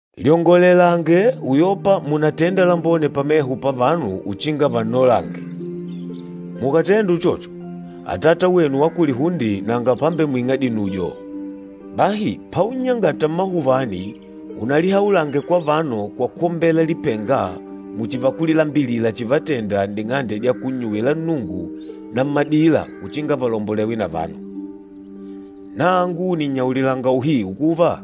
“Lyongolelange uyopa munatenda lambone pameho pa vanu uchinga vannolange. Mukàtenda uchocho, Atata wenu wa kulihunde nanga pambemwing'a dinujo. Bahi paunnyangata mmahuvani, unalihaulange kwa vanu kwa kwombela lipenga muchi vakulilambilila chivatenda n'ding'ande dya kunnyuwila Nnungu na mmadila uchinga valombolewe na vanu. Nangu nìnnyaulilanga uhiu kuva,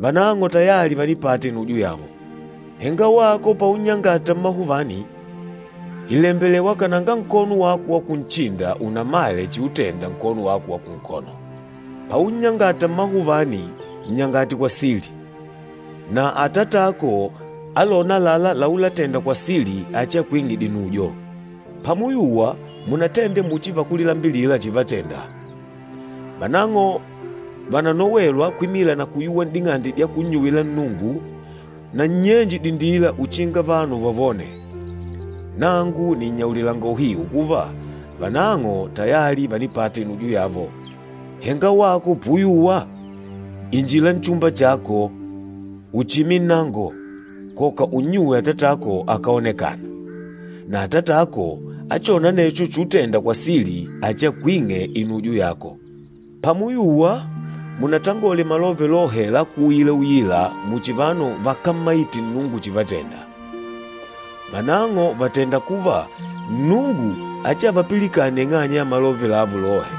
vanang'o tayali vànipata inujo yavo. Henga wako paunnyangata mmahuvani, ìlembelewa kananga nkono wako wa kunchinda unamale chiutenda nkono wako wa kunkono. Paunnyangata mmahuvani, nnyangate kwa sili, na Atatako alôna àlalá laulatenda kwa sili achiakwing'e dinujo.” “Pamuyuwa munatende muchi vakulilambilila chivatenda. Vanang'o vananowelwa kwimila na kuyuwa n'ding'ande dya kunnyuwila Nnungu na nnyenje dindila uchinga vanu vavone. Nangu nìnnyaulilanga uhiu kuva, vanang'o tayali vànipata inujo yavo. Henga wako puyuwa, injila nchumba chako, uchime nnango, koka unnyuwe Atatako akáoneka. Na Atatako, achôna anecho chutenda kwa sili achiakwing'e inujo yako. Pamuyuwa, munatangole malove lohe lákuuila-uila muchi vanu vakámmaite Nnungu chivatenda. Vanang'o vàtenda kuva Nnungu achiavapilikane ing'anya ya malove lavo lohe.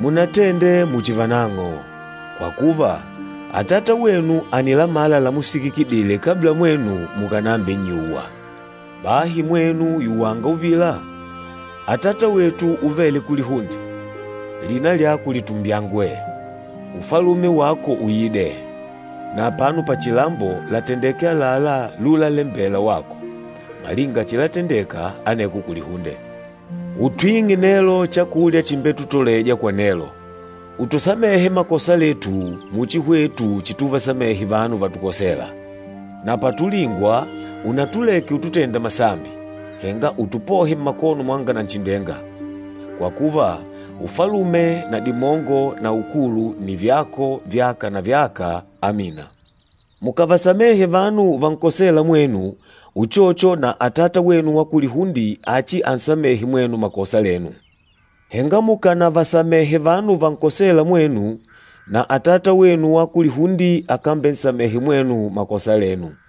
Munatende muchi vanang'o, kwa kuva, Atata wenu ànilamala lamusikikidile kabla mwenu mukànambinnyuwa. Bahi mwenu yuwanga uvila, ‘Atata wetu uvêle kulihunde, lina lyako litumbyangwe. Ufalume wako uide. Na apano pachilambo, latendeke àlalá lulalembela wako, malinga chilatendeka aneko kulihunde. Utwing'e nelo chakulya chimbetutoleja kwa nelo. Utusamehe makosa letu, muchi hwetu chituvasamehe vanu vatukosêla. Na patulingwa, unatuleke ututenda masambi, henga utupohe mmakono mwanga Nanchindenga. [Kwa kuva, Ufalume na dimongo na ukulu nni vyako, vyaka na vyaka. Amina.]’ Mukàvasamehe vanu vankosêla mwenu, uchocho na Atata wenu wa kulihunde achiansamehe mwenu makosa lenu. Henga mukánavasamehe vanu vankosêla mwenu, na Atata wenu wa kulihunde akambensamehe mwenu makosa lenu.”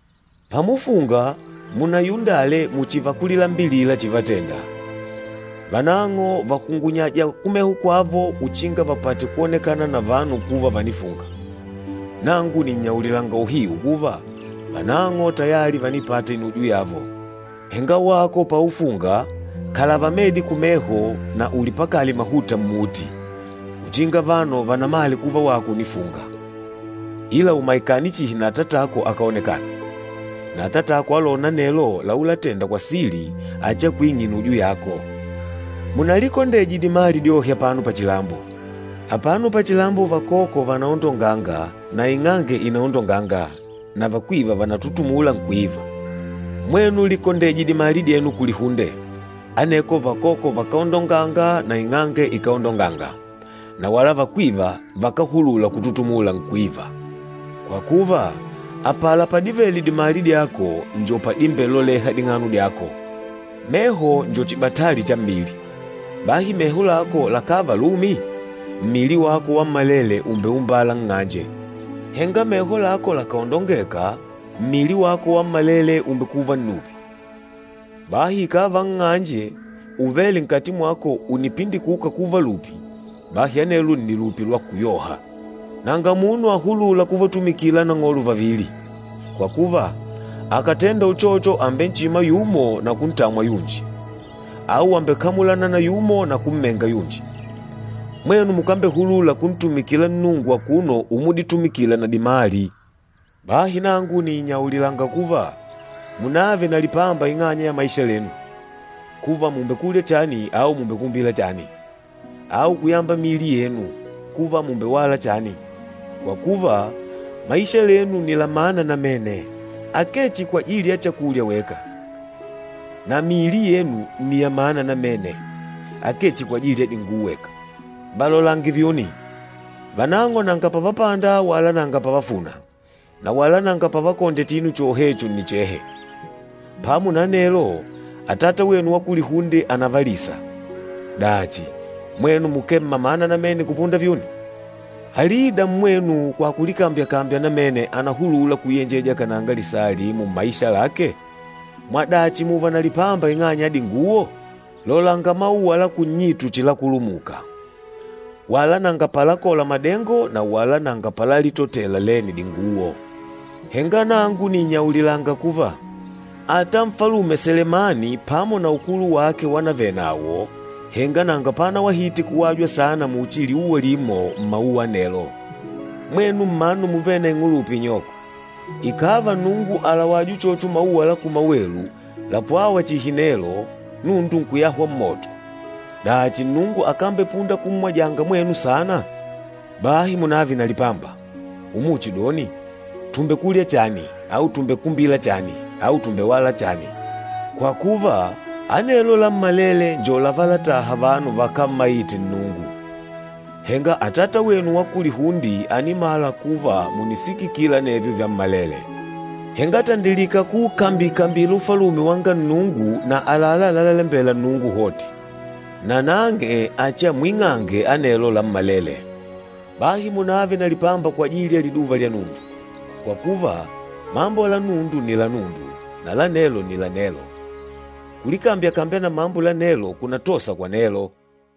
“Pamufunga, munayundale muchi vakulilambilila chivatenda. Vanang'o vakungunyaja kumeho kwavo uchinga vapate kwonekana na vanu kuva vanafunga. Nangu nìnnyaulilanga uhiu kuva, vanang'o tayali vànipata inujo yavo. Henga wako paufunga, kalava medi kumeho na ulipakale mahuta mmuti, uchinga vanu vanamale kuva wako unifunga, ila umaikane chihi na Atatako akáoneka. Na Atatako alôna anelo laulatenda kwa sili achiakwing'e inujo yako.” “Munalikondeje dimali dyohe apano pachilambo. Apano pachilambo vakoko vànaondonganga na ing'ange ìnaondonganga, na vakwiva vanatutumula nkwiva. Mwenu likondeje dimali dyenu kulihunde, aneko vakoko vakáondonganga na ing'ange ikáondonganga, na wala vakwiva vakáhulula kututumula, nkwiva. Kwa kuva, apala padivele dimali dyako njo padimbeloleha ding'ano dyako. Meho njo chibatali cha mmili. Bahi meho lako lakàva lumi, mmili wako wammalele ùmbeumbala nng'anje. Henga meho lako lakàondongeka, mmili wako wammalele ùmbekuva nnupi. Bahi ikàva nng'anje uvêle nkati mwako ùnipindikuka kuva lupi, bahi anelwo nni lupi lwa kuyoha! Nanga munu ahulûla kuvatumikila anang'olo vavili. Kwa kuva, akàtenda uchocho àmbemmenga yumo na kuntamwa yunji, au àmbekamulana na yumo na kunhebula yunji. Mwenu mukambehulula kuntumikila Nnungu akuno umuditumikila na dimali. Bahi nangu nìnnyaulilanga kuva, munààve na lipamba ing'anya ya maisha lenu, kuva mùmbekulya chani au mùmbekumbila chani, au kuyamba miili yenu, kuva mùmbewala chani. Kwa kuva, maisha lenu nni la mana namene, akee chihi kwajili ya chakulya weka. Na miili yenu nni ya mana namene, akee chihi kwajili ya dinguwo weka. Valolange vyuni. Vanang'o nanga pavapanda wala nanga pavafuna, na wala nanga pavakondya chinu chohecho nnichehe. Pamo na anelo, Atata wenu wa kulihunde ànavalisa. Dachi, mwenu mukee mmamana namene kupunda vyuni? Alida mmwenu kwa kulikambya-kambya namene ànahulula kuyenjeja kananga lisaa limo mmaisha lake? Mwadachi mùùva na lipamba ing'anya ya dinguwo? Lolanga mauwa la kunnyitu chilakulumuka. Wala nanga palakola madengo na wala nanga palalitotela lene dinguwo. Henga nangu nìnnyaulilanga kuva, ata Nfalume Selemani pamo na ukulu wake wanavele nawo, henga nanga panawahite kuwajwa saana muchi liuwa limo mmauwa anelo. Mwenu mmanu muvêle na ing'ulupa inyoko, ikàva Nnungu àlawaja uchocho mauwa la kumawelu, lapwâwa chihi nelo, nundu nkuyahwa mmoto, dachi Nnungu akambepunda kummwajanga mwenu saana? Bahi munààve na lipamba, umuchidoni, ‘Tùmbekulya chani,’ au ‘Tùmbekumbila chani,’ au ‘Tùmbewala chani!’ Kwa kuva, anelo lammalele njo lavátàhà vanu vakámmaite Nnungu. Henga Atata wenu wa kulihunde ànimala kuva mùnisikikila anevyo vyammalele. Henga tandilika kuukambi-kambila Ufalume wanga Nnungu na àlalá lalalembela Nnungu hoti, nanang'e achiamwing'ange anelo lammalele. Bahi munààve na lipamba kwajili ya liduva lya nundu, kwa kuva, mambo la nundu nni la nundu, na la nelo nni la nelo. Kulikambya-kambya na mambo la nelo kunatosa kwa nelo.”